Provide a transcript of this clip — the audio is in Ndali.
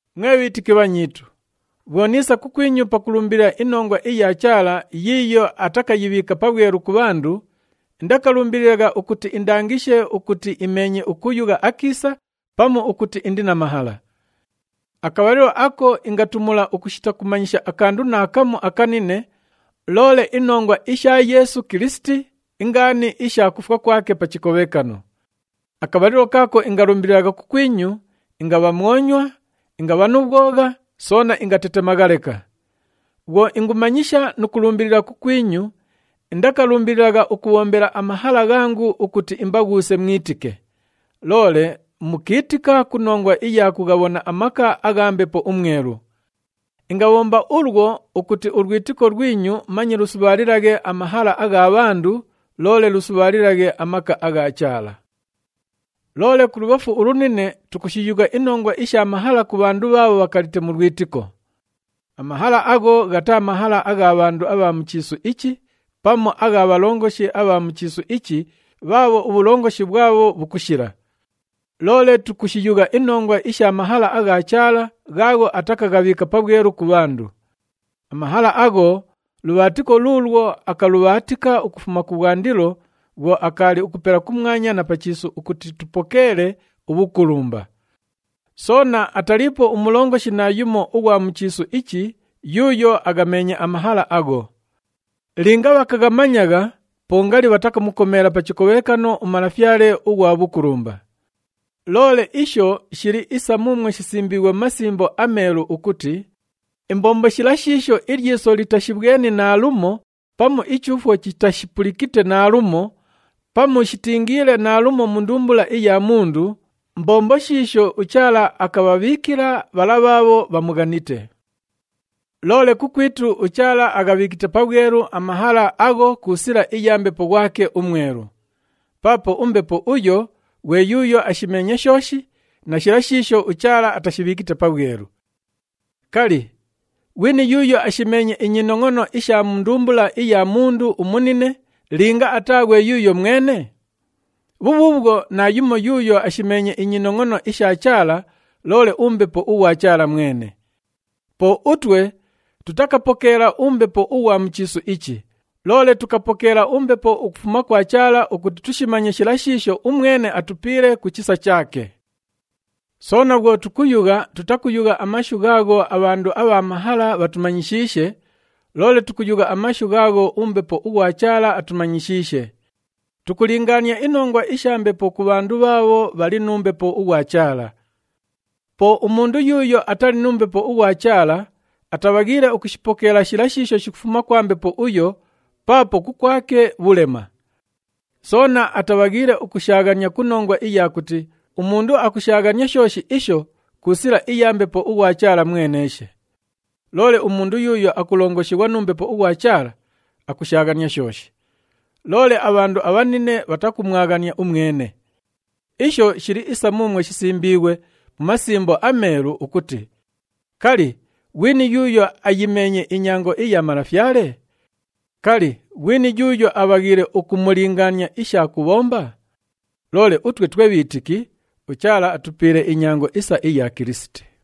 Mwe bhiitiki bhanyiitu, bhwo niisa kukwinyu pakulumbilila inongwa iya Chaala yiiyo atakayibhiika pabhwelu ku bhandu, indakalumbililagha ukuti indangishe ukuti imeenye ukuyugha akiisa pamu ukuti indi na mahala. Akabhalilo ako ingatumula ukushita kumanyisha akandu naakamu akanine loole inongwa isha Yeesu Kilisiti, ingaani isha kufwa kwake pa chikobhekano. Akabhalilo kaako ingalumbililagha kukwinyu, ingabha mwonywa, ingabha nu bhwogha, soona ingatetemagha leka. Bhwo ingumanyisha nu kulumbilila kukwinyu, indakalumbililagha ukubhombela amahala ghangu ukuti imbaghuuse mwitike, loole mukiitika ku nongwa iya kughabhona amaka agha Mbepo uMwelu. Ingabhomba ulwo ukuti ulwitiko lwinyu manye lusubhaalilaghe amahala agha bhandu, loole lusubhaalilaghe amaka agha Chaala. Loole kulubhafu ulunine, tukushiyugha inongwa isha mahala ku bhandu bhaabho bhakalite mu lwitiko. Amahala agho ghataa mahala agha bhandu abha mu chiisu ichi pamu agha bhalongoshi abha mu chiisu ichi bhaabho ubhulongoshi bhwabho bhukushila. Loole tukushiyugha inongwa isha mahala agha Chaala ghaagho atakaghabhiika pabhwelu ku bhandu. Amahala agho lubhaatiko luulwo akalubhaatika ukufuma kubhwandilo bhwo akaali ukupela kumwanya na pa chiisu ukuti tupokeele ubhukulumba. Soona ataliipo umulongoshi naayumo ughwa mu chiisu ichi yuuyo aghameenye amahala agho. Linga bhakaghamanyagha, po ngali bhatakamukomeela pa chikobhekano uMalafyale ughwa bhukulumba. Loole isho shili isa muumwo shisimbiighwe mu Masimbo aMeelu ukuti, “Imbombo shila shiisho ilyiso litashibhweni naalumo pamu ichuufwo chitashipulikite naalumo, (pamu shitiingile naalumo mu ndumbula iya mundu) mbombo shiisho uChaala akabhabhiikila bhala bhaabho bhamughanite.” Loole kukwitu, uChaala aghabhiikite pabhwelu amahala agho ku sila iya Mbepo ghwake uMwelu. Paapo uMbepo uyo ghwe yuuyo ashimeenye shooshi, na shila shiisho uChaala atashibhiikite pabhwelu. Kali, ghwini yuuyo ashimeenye inyinongʼono isha mu ndumbula iya mundu umunine linga ataa ghwe yuuyo mwene? Bhubhuubhwo, naayumo yuuyo ashimeenye inyinongʼono isha Chaala loole uMbepo ughwa Chaala mwene. Po utwe tutakapokeela umbepo ughwa mu chiisu ichi, loole tukapokeela uMbepo ukufuma kwa Chaala ukuti tushimanye shila shiisho umwene atupiile ku chisa chaake. Soona bhwo tukuyugha, tutakuyugha amashu ghaagho abhandu abha mahala bhatumanyishiishe, loole tukuyugha amashu ghaagho uMbepo ughwa Chaala atumanyishiishe. Tukulingaania inongwa isha Mbepo ku bhandu bhaabho bhali nu Mbepo ughwa Chaala. Po umundu yuuyo atali nu Mbepo ughwa Chaala, atabhaghiile ukushipokeela shila shiisho shikufuma kwa Mbepo uyo paapo kukwake bhulema. Soona atabhaghiile ukushaaghania ku nongwa iya kuti umundu akushaaghania shooshi isho ku sila iya Mbepo ughwa Chaala mweneeshe. Loole umundu yuuyo akulongoshighwa nu Mbepo ughwa Chaala, akushaaghania shooshi. Loole abhandu abhanine bhatakumwaghania umwene. Isho shili isa muumwo shisimbiighwe mu Masimbo aMeelu ukuti, “Kali, ghwini yuuyo ayimeenye inyango iya Malafyale? Kali, ghwini yuuyo abhaghiile ukumulingaania isha kubhomba?” Loole utwe twe bhiitiki, uChaala atupiile inyango isa iya Kilisiti.